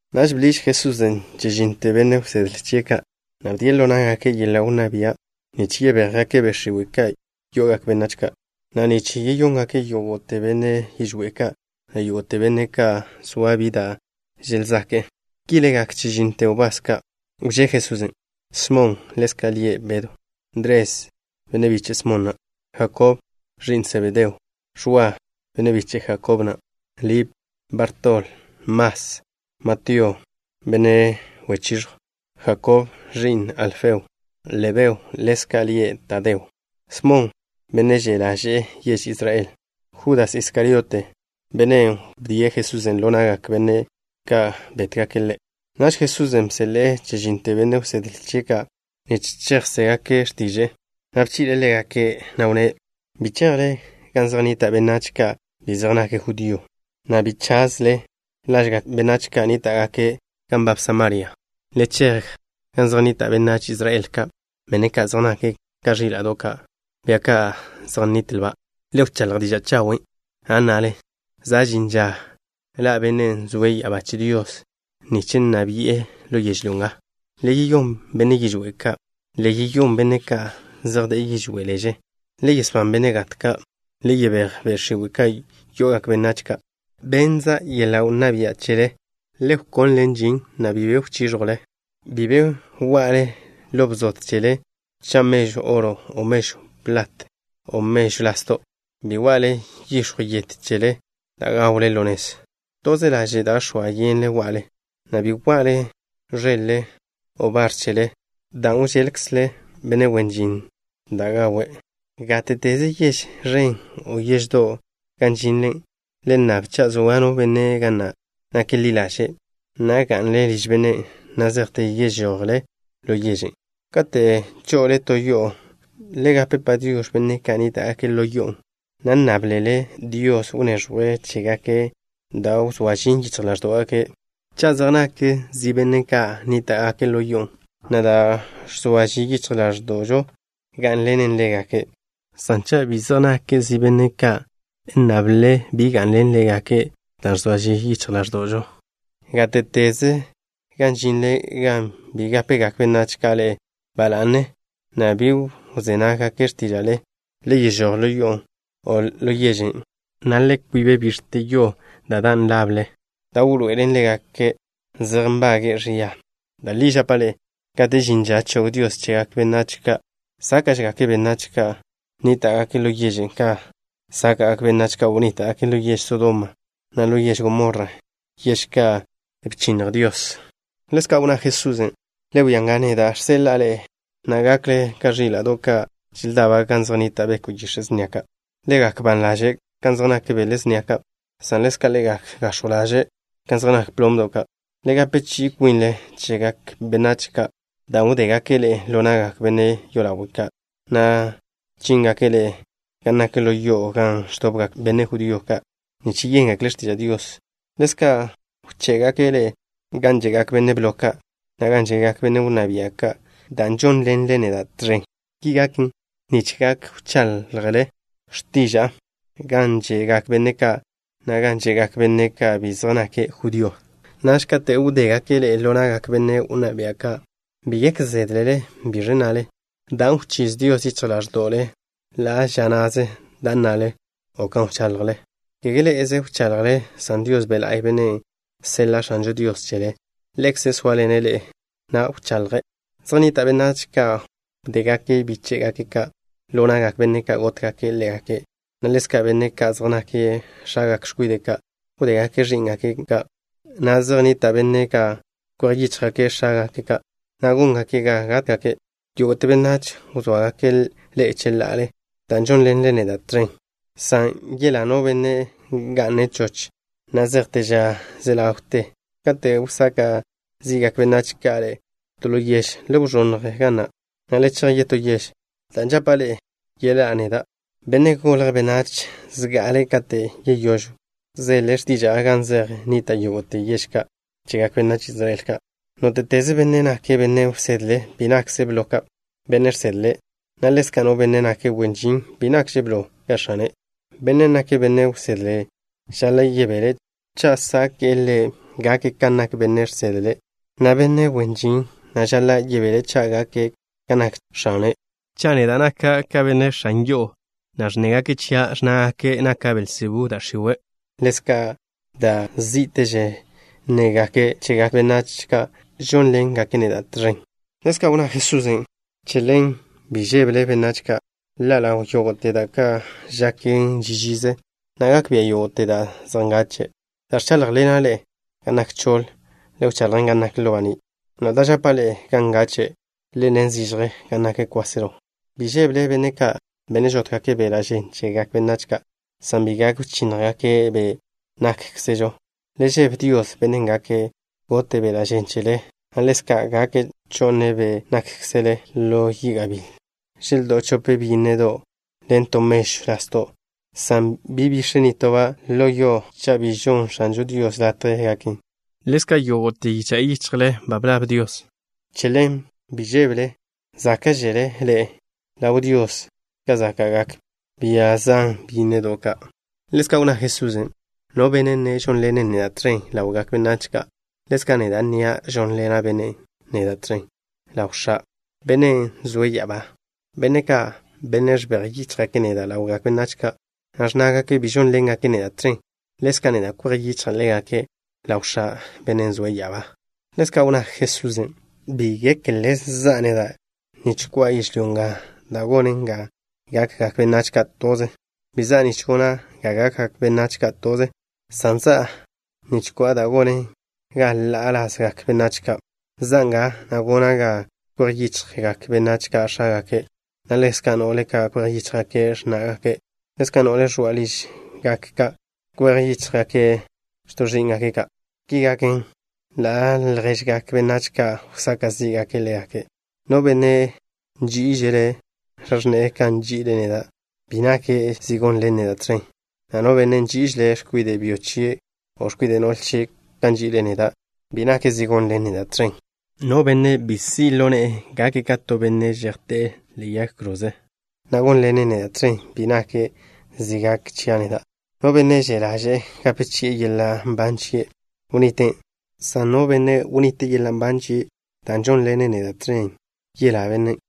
Naž bḻiž Jesusen' chežínnote benne' wsedle chie' ka', na' bdie' ḻo ná'gake' yeḻa' wnná bia' nich yebéjgake' be' x̱iwe' ka' yo'ogak benách ka', na' nich yeyóngake' yógo'te benne' yižwé' ka', na' yógo'te benne' ka' zoa bi da' želzake'e. Ki legak chežínnote wbás ka' wžé Jesusen': Smon, (ḻezka' lie' Bedw). Ndres, (biche' Smon na'). Jakob, (ẕi'n Sebedeo). Ẕwa, (biche' Jakob na'). Lip. Bartol. Mas. Matío, (benne' wechiẕjw). Jakob, (ẕi'n Alfeo). Lebeo, (ḻezka' lie' Tadeo). Smon, (benne' že' ḻaže'e yež Israel). Judas Iskariote, (bennen' wdíe' Jesusen' ḻo na'gak benne' ka' gótgake' Ḻe'). Naž Jesusen' bseḻe'e chežínnote benne' wsedle chie' ka' nich chejzégake' x̱tiže'e, na' bchi'le' ḻégake', na' wnné': —Bi chejle gan zej nnita' benách ka' bi zej nake' judío, na' bi chazle lažgak benách ka' nníta'gake' gan nbab Samaria. Le chej gan zej nnita' benách Israel ka', benne' zej nake' ka ẕíla'do' ka', bia ka' zej nnitlba'. Le wcháḻj diža' chawen', na' nnale: “Za' žin ža ḻa' Bennen' zoe' ya'abá che Dios nich nna bi'e ḻo yežlyó nga.” Le yeyón benne' yižwé' ka'. Le yeyón benne' ka' zej de'e yižwé' leže. Le yesbán benne' gat ka'. Le yebéj be' x̱iwe' ka' yo'ogak benách ka'. Bennza' yeḻa' wnná bia' ni chele. Le wkonlen žin, na' bi be wchíẕjwle. ’Bi be wa'le ḻo bzod chele, cha' mežw oro, o mežw plat, o mežw lasdo'. Bi wa'le yix̱jw yet chele da' gawle ḻo nez. Toze laže' da' x̱oa yenle wa'le, na' bi wa'le ẕeḻ-le, o bar chele, dan' wžeḻkzle benne' wen žin da' gawe'. ’Gáte'teze yež ẕen, o yeždo' gan žinle, le nnab cha' zoa no benne' ga na' nake' ḻi ḻaže', na' ga'nle liž bennen' na' zejte yežojle ḻo yežen'. Kate' cho'le to yo'o, le gape “Padiox̱” benne' ka' nníta'gake' yo'on', na' nnáblele Dios wneẕjwe' chégake' da' wzóa žin yichj ḻáẕdo'gake'. Cha' zej nak zi benne' ka' nníta'gake' yo'on', na' da' ẕzoa žin yichj ḻáẕdo'žo gá'nḻenen ḻégake', san cha' bi zej nak zi benne' ka', nnable bi ga'nḻen ḻégake' dan' ẕzoa žin yichj ḻáẕdo'žo. Gáte'teze gan žinle gan bi gápegak benách ka' ḻe'e ba la'ne, na' bi wzé nággake' x̱tíža'le, le yežój ḻo yo'on', o ḻo yežen', na' le kwib bix̱te yo da' dan' lable, da' wḻoe'elen ḻégake' zej nbage'e ẕia. Da' li žapa' ḻe'e, kate' žin ža chog Dios chegak benách ka' sáka'gake', sáka'žegak benách ka' nníta'gake' ḻo yežen' ka sáka'gak benách ka' wnníta'gake' ḻo yež Sodoma, na' ḻo yež Gomorra, yež ka' bchinnj Dios. Ḻezka' wnná Jesusen': —Le wia nga, neda' žseḻa'a ḻe'e, na' gakle ka ẕíla'do' ka' želdaba' gan zej nnita' beko' yix̱e' snia ka'. Le gak ban ḻaže' kan zej nak bele snia ka', san ḻezka' le gak gax̱jw ḻaže' kan zej nak plomdo' ka'. Le gape chi'i kwinle chegak benách ka', dan' wdégake' ḻe'e ḻo na'gak benne' yolawe' ka', na' chíngake' ḻe'e gan nak ḻo yo'o gan ẕdobgak benne' judío ka' nich yéngekle' x̱tiža' Dios. Ḻezka' wché'gake' ḻe'e gan že'gak benne' blo ka', na' gan že'gak benne' wnná bia' ka', dan' žónḻenle neda' tẕen. Ki gaken nich gak wchaḻjle x̱tiža'a gan že'gak benne' ka', na' gan že'gak benne' ka' bi zej nake' judío. Naž kate' wdégake' ḻe'e ḻo na'gak benne' wnná bia' ka', bi gek zédlele biẕ nnale, dan' wchíz Dios yichj ḻáẕdo'le ḻa' ža na'ze da' nnale, o kan wchaḻjle. Kege ḻé'ezele wchaḻjle, san Dios Be' La'y, Bennen' seḻa' X̱ažo Dios chele, Ḻekze' sóaḻene' ḻe'e, na' wchaḻje'. ’Zej nnita' benách ka' wdégake' bíche'gake' ka' ḻo na'gak benne' ka' gótgake' ḻégake', na' ḻezka' benne' ka' zej nake' x̱agak x̱kwide' ka' wdégake' ẕí'ngake' ka', na' zej nnita' benne' ka' kwej yíchjgake' x̱ágake' ka', na' góngake' ga gátgake'. Yógo'te benách wzóagake' ḻe'e cheḻa'ale dan' žónḻenle neda' tẕen, san yelá no benne' ga'ne' choch na' zejte ža ze ḻawte ža ka'. Kate' wsaka' zi'gak benách ka' ḻe'e to ḻo yež, le wẕónnj ga na', na' le chej yetó yež, dan' žapa' ḻe'e, yeḻá'a neda', Benne' Golje' Benách, zga'ale kate' yeyóž wzele x̱tiža'a gan zej nnita' yógo'te yež ka' chegak benách Israel ka'. ’Nóte'teze benne' nake' benne' wsedle bi nakže' blo ka bennen' žsedle' ḻe', na' ḻezka' no benne' nake' wen žin bi nakže' blo ka x̱ane'. Bennen' nake' benne' wsedle žaḻa' yebele' cha' sáke'le' gake' kan nak bennen' žsedle' ḻe', na' benne' wen žin na' žaḻa' yebele' cha' gake' kan nak x̱ane'. Cha' neda' naka' ka benne' x̱an yo'o, na' ẕnnégake' chia', ẕnnágake' naka' Belzebú da' x̱iwe', ḻezka' da' zí'teže nnégake' chegak benách ka' žónḻengake' neda' tẕen. Ḻezka' wnná Jesusen': —Che ḻen, bi žébele benách ka'. Ḻa' ḻaw yógo'te da' ka' žaken ži žize, na' gak bia' yógo'te da' zej ngache'. Da' ẕcháḻjḻena' ḻe'e gan nak choḻ, le wchaḻjen gan nak ḻo baní', na' da' žapa' ḻe'e gan ngache', le nne zižje gan nak kwáselo. Bi žébele benne' ka', benne' žótgake' beḻa' žen chegak benách ka', san bi gak wchínnjgake' be' nákkzežo. Le žebe Dios, Bennen' gak gote' beḻa' žen chele, na' ḻezka' gak cho'ne' be' nákkzele ḻo yi' gabíl. ’Želdó'o chope byínnedo' ḻen to mežw lasdo', san bi bix̱e nitoba' ḻo yo cha' bi žonn X̱ažo Dios latje gaken. Ḻezka' yógo'te yicha' yichjle ba blab Dios. Che ḻen, bi žébele. Záka'žele ḻe'e ḻaw Dios ka záka'gak bia zan byínnedo' ka'. Ḻezka' wnná Jesusen': —No benne' nne' žónḻene' neda' tẕen ḻawgak benách ka', ḻezka' neda' nnia' žonḻen bennen' neda' tẕen ḻaw X̱a', Bennen' zoe' ya'abá. Benne' ka', benne' ẕbej yíchjgake' neda' ḻawgak benách ka', na' ẕnnágake' bi žónḻengake' neda' tẕen, ḻezka' neda' kwej yichja' ḻégake' ḻaw X̱a', Bennen' zoe' ya'abá. Ḻezka' wnná Jesusen': —Bi gekle za'a neda' nich ko'a yežlyó nga da' gonen ga gakgak benách ka' toze. Bi za'a nich gona' ga gakgak benách ka' toze, san za'a nich ko'a da' gonen ga ḻa'a lazgak benách ka'. Za'a nga, na' gona' ga kwej yichjgak benách ka' x̱ágake', na' ḻezka' no'le ka' kwej yíchjgake' x̱ná'gake'. Ḻezka' no'le ẕoa' ližgak ka' kwej yíchjgake' x̱to' ẕí'ngake' ka'. Ki gaken, ḻa' lježgak benách ka' wsaka' zí'gake' ḻégake'. ’No benne' nží'ižele' x̱a x̱ne'e ka nži'ile' neda', bi nake' zi gónḻene' neda' tẕen, na' no benne' nží'ižele' x̱kwide' byo chie' o x̱kwide' no'le chie' ka nži'ile' neda', bi nake' zi gónḻene' neda' tẕen. No benne' bi si' ḻo ne'e gake' ka to benne' zejté'e ḻe'e yag kroze, na' gónḻene' neda' tẕen, bi nake' zi gake' chia' neda'. No benne' že' ḻaže'e gape chi'e yeḻa' nban chie', wniten', san no benne' wnite' yeḻa' nban chie' dan' žónḻene' neda' tẕen, yelá bennen'.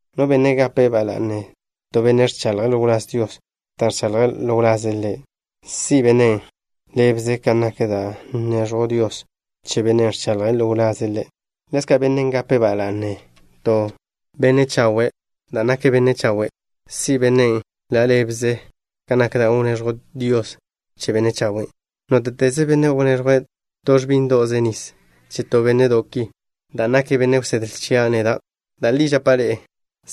No benne' gape' ba la'ne to benne' ẕchaḻje' ḻo wláz Dios dan' ẕchaḻje' ḻo wlaze' Ḻe', si' bennen' ḻa' ḻébeze kan nak da' wneẕjw Dios che bennen' ẕchaḻje' ḻo wlaze' Ḻe'. Ḻezka' no benne' gape' ba la'ne to benne' chawe' dan' nake' benne' chawe', si' bennen' ḻa' ḻébeze kan nak da' wneẕjw Dios che benne' chawen'. Nóte'teze benne' wneẕjwe' to ẕbíndo'ze nis che to bénne'do' ki dan' nake' benne' wsedle chia' neda', da' li žapa' ḻe'e,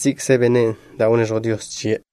si'kze bennen' da' wneẕjw Dios chie'.